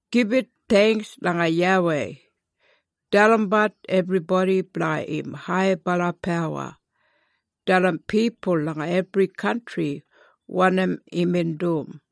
Gibit theingks langa YAWEI. Dalimbat ebribodi blanga im haibala pawa. Dalim pipul langa ebri kantri wanim imbin dum.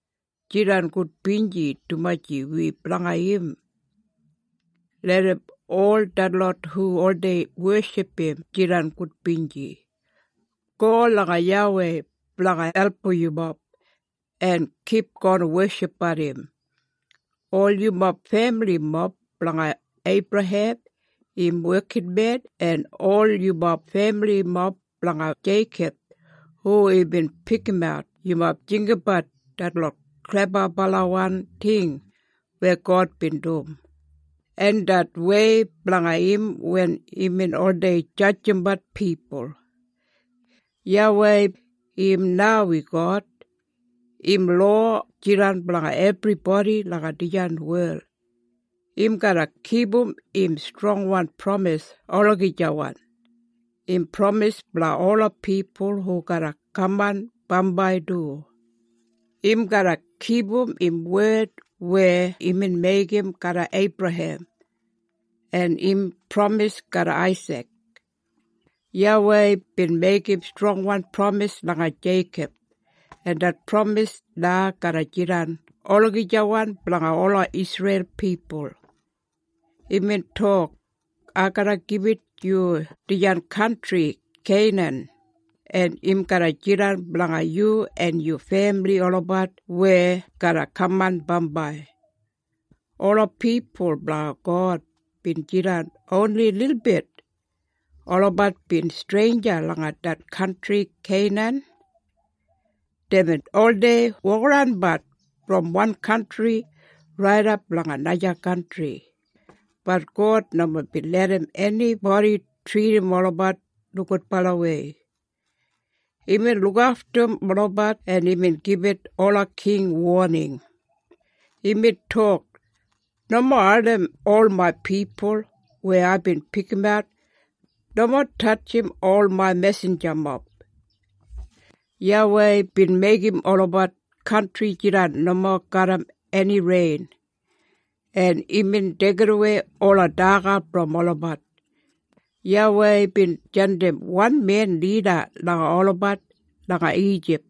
Jidan gudbinji dumaji wi blanga im. Larram ol detlot hu oldei weship im jidan gudbinji. Go langa YAWEI blanga album yumob, en kipgon weshipbat im. Ol yumob femilimob blanga Eibrahem im wekinmen, en ol yumob femilimob blanga Jeikob, hu imbin pikimat, yumob jinggabat detlot klebabalawan ting weya God bin dum, en det wei blanga im wen imbin oldei jadjimbat pipul. YAWEI im na wi God. Im lowa jidan blanga ebribodi langa dijan wel. Im garra kipum im strongwan pramis olagijawan. Im pramis blanga ola pipul hu garra kaman bambai du. Im garra kipum im wed weya imbin meigim garram Eibrahem, en im pramis garram Aisik. YAWEI bin meigim strongwan pramis langa Jeikob, en det pramis na garra jidan olagijawan blanga ola Isreil pipul. Imbin tok, “Ai garra gibit yu dijan kantri Keinan, en im garra jidan blanga yu en yu femili olabat weya garra kaman bambai.” Ola pipul blanga God bin jidan oni lilbit. Olabat bin streinja langa det kantri Keinan. Deibin oldei wokaranbat brom wan kantri raidap langa naja kantri. Bat God nomo bin larram enibodi tridim olabat nogudbalawei. Imbin lukaftum olabat en imbin gibit ola king woning. Imbin tok, “Nomo ardim ol main pipul weya aibin pikimat. Nomo tatjim ol main mesinjamob.” YAWEI bin meigim olabat kantri jidan nomo garram eni rein, en imbin deigidawei ola daga brom olabat. YAWEI bin jandim wan men lida langa olabat langa Ijip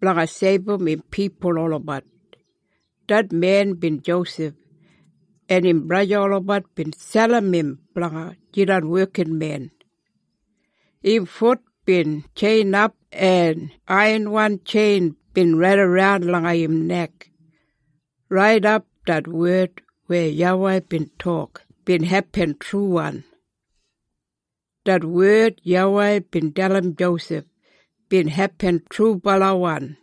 blanga seibum im pipul olabat. Det men bin Josef, en im braja olabat bin selim im blanga jidan wekinmen. Im fut bin tjeinap en aiyanwan tjein bin raidaran langa im nek, raidap det wed weya YAWEI bin tok bin hepin truwan. Det wed YAWEI bin dalim Josef bin hepin trubalawan.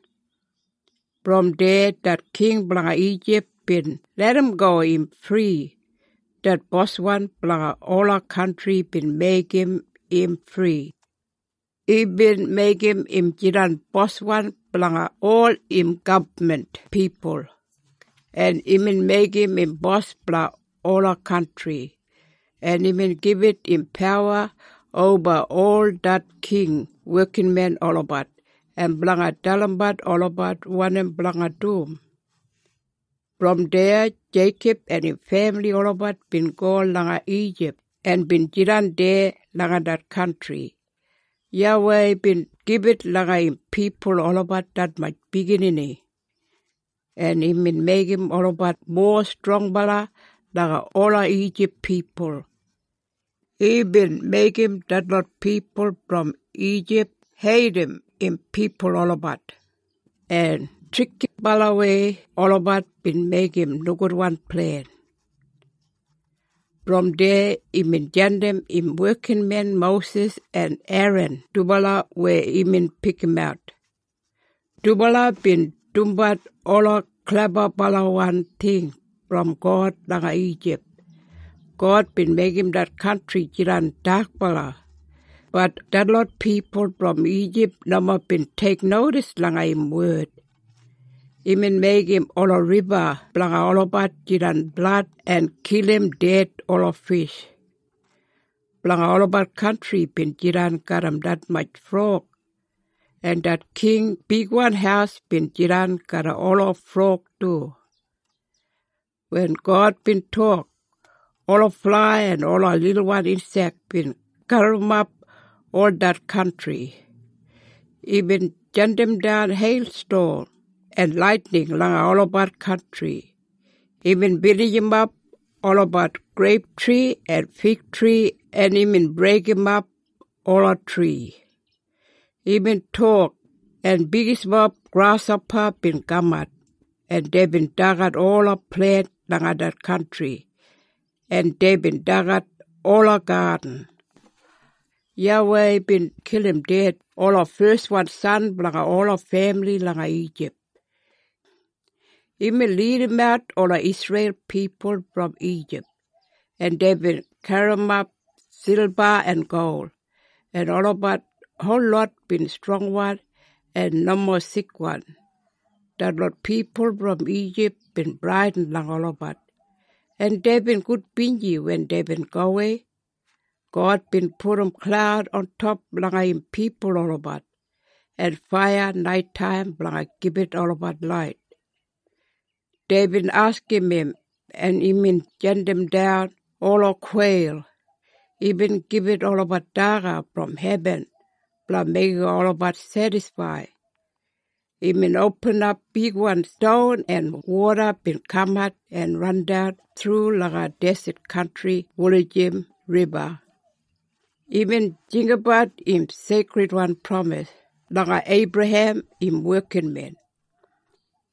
Brom deya, det king blanga Ijip bin larramgo im fri. Det boswan blanga ola kantri bin meigim im fri. Imbin meigim im jidan boswan blanga ol im gabman pipul, en imbin meigim im bos blanga ola kantri, en imbin gibit im pawa oba ol det king wekinmen olabat, en blanga dalimbat olabat wanim blanga dum. Brom deya Jeikob en im femili olabat bin go langa Ijip en bin jidan deya langa det kantri. YAWEI bin gibit langa im pipul olabat detmatj biginini, en imbin meigim olabat mowa strongbala langa ola Ijip pipul. Imbin meigim detlot pipul brom Ijip heidim im pipul olabat, en trikibalawei olabat bin meigim nogudwan plen. Brom deya imbin jandim im wekinmen Mosis en Eran dubala weya imbin pikimat. Dubala bin dumbat ola klebabalawan ting brom God langa Ijip. God bin meigim det kantri jidan dakbala, bat detlot pipul brom Ijip nomo bin teiknodis langa im wed. Imbin meigim ola riba blanga olabat jidan blad en kilim ded ola fish. Blanga olabat kantri bin jidan garram detmatj frog, en det king bigwan haus bin jidan garram ola frog du. Wen God bin tok, ola flai en ola lilwan insek bin gaburrumap ol det kantri. Imbin jandimdan heilston en laitining langa olabat kantri. Imbin binijimap olabat greiptri en figtri en imbin breigimap ola tri. Imbin tok, en bigismob grashopa bin kamat, en deibin dagat ola plent langa det kantri, en deibin dagat ola gadin. YAWEI bin kilim ded ola feswan san blanga ola femili langa Ijip. Imbin lidimat ola Isreil pipul brom Ijip, en deibin garrimap silba en gol, en olabat holot bin strongwan en nomo sikwan. Detlot pipul brom Ijip bin bradin langa olabat, en deibin gudbinji wen deibin gowei. God bin pudum klaud ontop langa im pipul olabat, en faiya naitaim blanga gibit olabat lait. Deibin askim im, en imbin jandimdan ola kweil. Imbin gibit olabat daga brom hebin blanga meigim olabat sedisfaid. Imbin opinimap bigwan ston en woda bin kamat en randan thru langa deset kantri wulijim riba. Imbin jinggabat im seikridwan pramis langa Eibrahem, im wekinmen.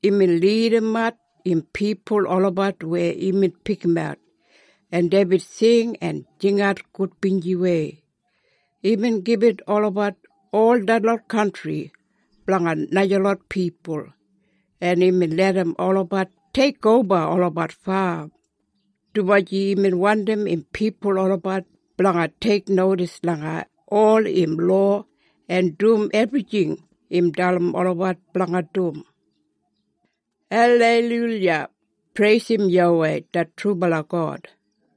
Imbin lidimat im pipul olabat weya imbin pikimat, en deibin sing en jingat gudbinjiwei. Imbin gibit olabat ol detlot kantri blanga najalot pipul, en imbin larram olabat teikoba olabat fam, dumaji imbin wandim im pipul olabat blanga teiknodis langa ol im lowa en dum ebrijing im dalim olabat blanga dum. Aleiluya! Preisim YAWEI det trubala God!